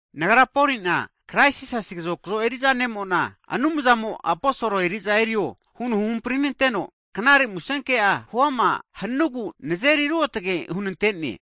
Nagra Poli'na, Kraisi Jisasi kazokzo eri'za ne'mo'na, Anumzamo aposol eri'za erio huno huhampri'nanteno, knare musenke'a huama hanugu nazeri ruotge hunantene.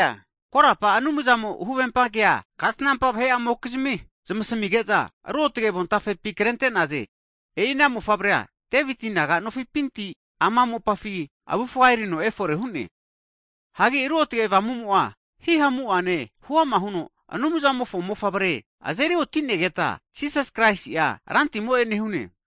Korapa Anumzamo huvempa kea kasnampa vahe'amokizmi zmasamige'za, Ruotge Avontafepi krente'naze. E'i ana Mofavre'a Deviti naga nofipinti, ne'mo ama mopafi avufga erino efore hu'ne. Hagi Ruotge Avamumo'a hihamu'ane huama huno, Anumzamofo Mofavre azeri oti'negeta, Jisas Kraisi'a Rantimo'e nehune.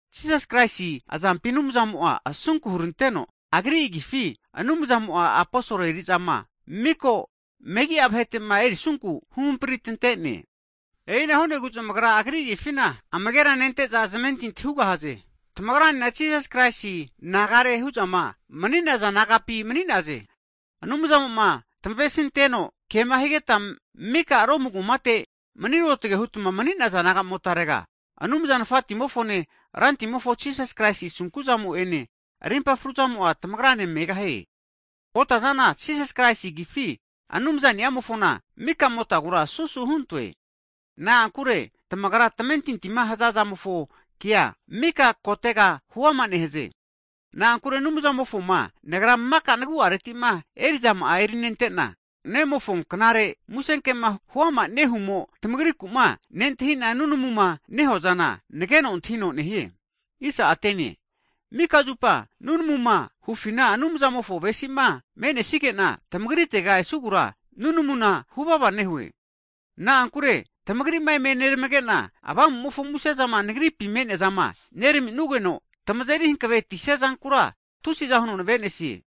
Jisas Kraisi azampi Anumzamo'a asunku huranteno, Agri agifi Anumzamo'a aposol eri'zama miko megi'a vahetema erisunku huhampritantene. E'ina hu'negu zmagra Agri Agifina amagera nente'za zamentintia hugahaze. Tamagranena Jisas Kraisi nagare hu'zama mani'naza nagapi mani'naze. Anumzamo'ma tmavesinteno kema higeta mika Romu kumate mni ruotge hutma mni'naza nagamotarega, Anumza Nafatimofone Rantimofo Jisasi Kraisi asunku'zamo'ene, rimpa fruzamo'a tamagra ne megahie. Kota'zana, Jisas Kraisi agifi, Anumza ni'amofona maka'motamagura susu huntue. Na'ankure tamagra tamentintima haza zamofo kea, mika kotega huama nehaze. Na'ankure Anumzamofoma nagra maka nagu'aretima eri'zama'a erinentena, Nemofo knare musenkema huama nehumo, tamagriku'ma nentahi'na nunamuma nehuazana, nageno antahino nehie. Mika zupa nunamuma hufina, Anumzamofo avesima menesigena, tamagritega esugura nunamuna huvava nehue. Na'ankure tamagri'ma eme neramagena, Avamumofo musezama nagripi me'neazama nerami'nugeno, tamazeri hanavetisia zankura tusi'za huno navenesie.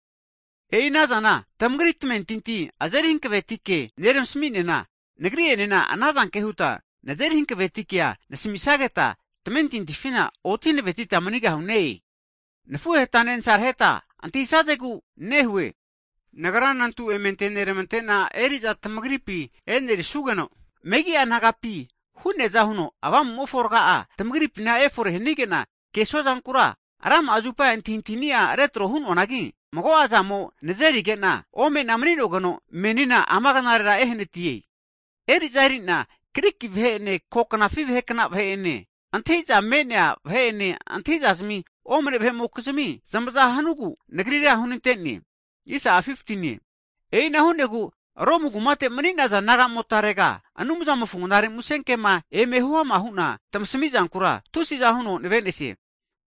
E'i ana zana, tamagri tamentinti azeri hankaveti ke neramasami'nena, nagri'enena ana zanke huta nazeri hanaveti kea nenasamisageta tamentintifina oti hanavetita manigahune. Nafuhetane nasaraheta antahisazegu nehue. Nagra nantu eme antenermantena eri'za tamagripi enerisugeno, megi'a nagapi hu'neaza huno Avamumofo rga'a tamagripima efore hanigena kesua zankura, rama'a zupa antahintahini'a retro hu'noanagi mago'a zamo nazerigena, omena mani'nogeno menina ama knarera ehanatie. Eri'za eri'na, Griki vahe'ene, ko knafi vahekna vahe'ene antahintahiza me'nea vahe'ene, antahintahiza omne vahe'mokizmine, zmaza hanugu Nagrira hunantene. E'ina hu'negu Romu kumate mni'naza nagamotarega, Anumzamofo knare musenkema eme huama hu'na tamasamizankura tusi'za huno navenesie.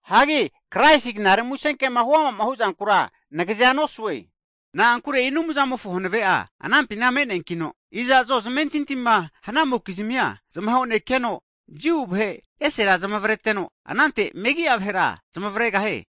Na'ankure Kraisi knare musenkegura nagazea nosue. Na'ankure e'i Anumzamofo hanave'a anampina me'neankino, iza'zo zamentintima hanamokizmia zmahonekeno, Jiu vahe esera zamavreteno, anante megi'a vahera zamavregahie.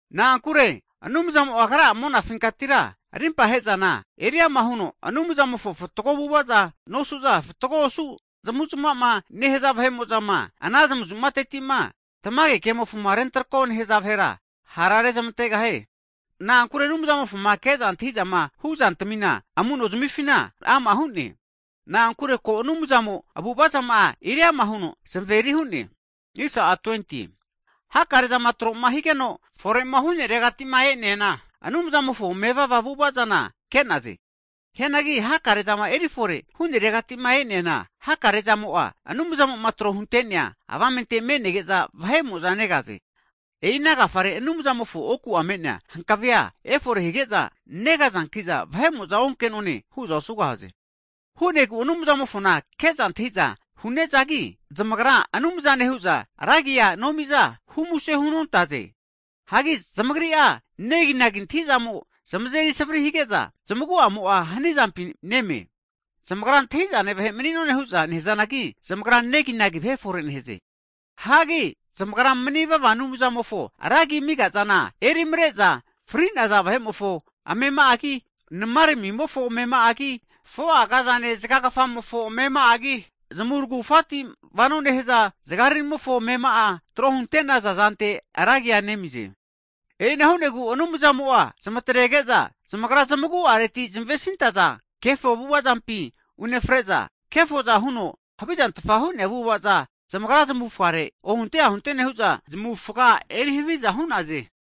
Na'ankure Anumzamo'a, Agra'a monafinkatira rimpahezana eri'ama huno, Anumzamofo fatgo avu'ava nosu'za, fatgo osu zmavuzmava nehaza vahe'mozama ana zamuzmateti'ma, tamage kemofo rentrako nehaza vahera ha'rezamantegahie. Na'ankure Anumzamofoku'ma ke'za antahizama huzantmina amuno zmifina ama hu'ne. Na'ankure ko Anumzamo avu'avazama'a eriama huno zmaveri hu'ne. Hakare'zama troma higeno fore'ma hu'neregatima e'neana, Anumzamofo mevava avu'avazana ke'naze. Hianagi hakare'zama erifore huneregatima e'neana hakarezamo'a Anumzamo'ma tro hunte'nea avamente nege'za vahe'mo'za negaze. E'i ana agafare Anumzamofo oku me'nea hankave efore hige'za negazankiza, vahe'mo'za onke'none hu'za osugahaze. Hu'negu Anumzamofona ke'za antahiza hu'nezagi, zamagra Anumzane hu'za ra agi'a nomiza, humuse hunontaze. Hagi zamagri'a neginagi antahintahizamo zmazeri savri hige'na, zmagu'amo'a hanizampi neme. Zamagra antahi'zane vahe mani'none hu'za nehazanagi, zamagra neginagi vahe fore nehaze. Hagi zamagra manivava Anumzamofo ra agima amigazana, erimare'za fri'naza vahe'mofo amema'agi, nmaramimofo amema'agi, 4'a agazane zagagfamofo amema'agi, zmurugufati vano nehaza zgaramimofo amema'a tro hunte'naza zante ra agi nemize. E'ina hu'nagu Anumzamo'a zmatrege'za, zamagra zamaguareti zamavesintaza kefo avu'avazampi unefre'za, kefoza huno havizantfa hu'nea avu'avaza zamagra zamufgare ohunte ahunte nehu'za, zamufga eri haviza hu'naze.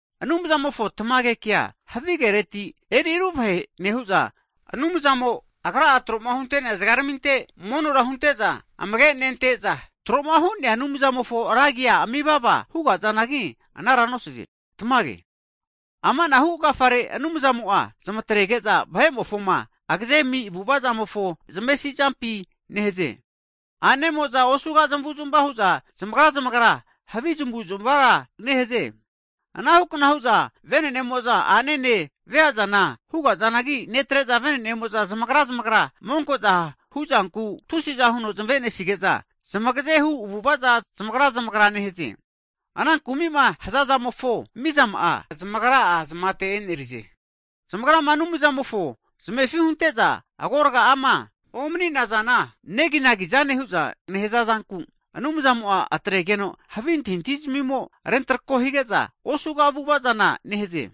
Anumzamofo tamage kea, havigereti eri revahe nehu'za, Anumzamo, Agra'a troma hunte'nea zgaraminte monora hunte'za amage nente'za, troma hu'nea Anumzamofo ra agia amivava hugazanagi anara nosaze. Tamage. Ama anahu agafare Anumzamo'a zmatrege'za, vahe'mofoma agaze ami avu'avazamofo zmavesizampi nehaze. Ane'mo'za osuga zmavu'zmava hu'za zmagra zmagra havi zamavu'zmavara nehaze. Anahukna hu'za, venene'mo'za a'nene veazana hugazanagi, netre'za, venenemo'za zmagra zmagra monkozama hu'zanku tusiza huno zamavenesige'za, zamagaze hu avu'avaza zmagra zmagra nehaze. Ana kumima hazazamofo, mizama'a zmagra'a zamata enerize. Zamagrama Anumzamofo zmefi hunte'za agorga'ama omninazana neginagi zane hu'za nehaza zanku, Anumzamo'a atregeno havi antahintahizazmimo rentrako hige'za, osuga avu'avazana nehaze.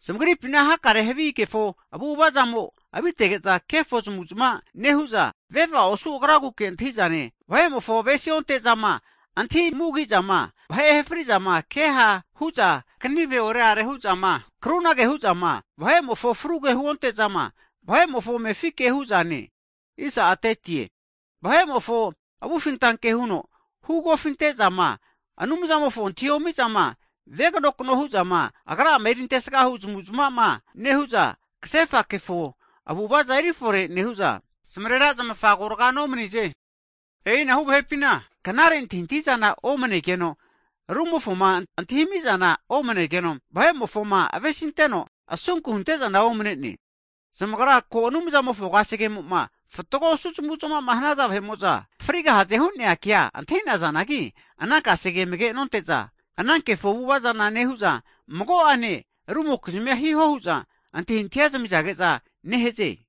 Zamagripina hakare havi kefo avu'ava zamo'a avitege'za, kefo zmuzma nehu'za, veva osu agraguke antahizane, vahe'mofo avesi onte'zama, antahi mugizama, vahe ahefri'zama, ke ha' huza kanive oreare huzama, krunage hu'zama, vahe'mofo fruge huonte'zama, vahe'mofo amefi ke hu'zane, vahe'mofo avufintanke huno hu kofinte'zama, Anumzamofo antahiomizama, veganokno huzama, agra'ama erintesga hu zmavuzmava nehu'za, kasefa kefo avu'avaza eri fore nehu'za, zmarera zmafa agorga nomnize. E'inahu vahepina knare antahintahizana omanegeno, rumofoma antahimizana omanegeno, vahe'mofoma avesinteno, asunku huntezana omanene. Zamagra ko Anumzamofo kasegemo'ma fatgo osu zmavu'zmavama hanaza vahe'mo'za frigahaze hu'nea kea antahinazanagi, ana kesegea amage nonte'za, ana kefo avu'avazana nehu'za, mago'ane rumokizmia hiho hu'za antahintahia zamizage'za nehaze.